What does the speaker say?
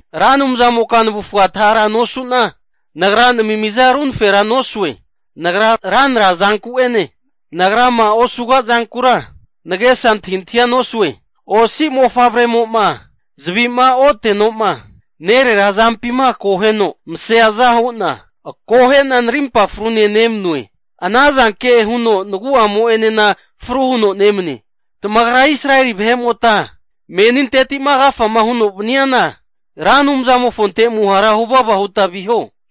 Ra Anumzamoka navufga atahara nosuna, nagra namimiza runafagera nosue. Nagra ranra zanku'ene, nagrama osuga zankura nagesa antahintahia nosue. Osi mofavremo'ma zavima ote'noma nerera azampima akoheno maseaza hu'na, akohe'na narimpa frune nemanue. Ana zanke huno nagu'amo'enena fru huno nemane. Tamagra Israeli vahe'mota meninteti'ma agafama huno vaniana Ra Anumzamofonte amuhara huvava huta viho.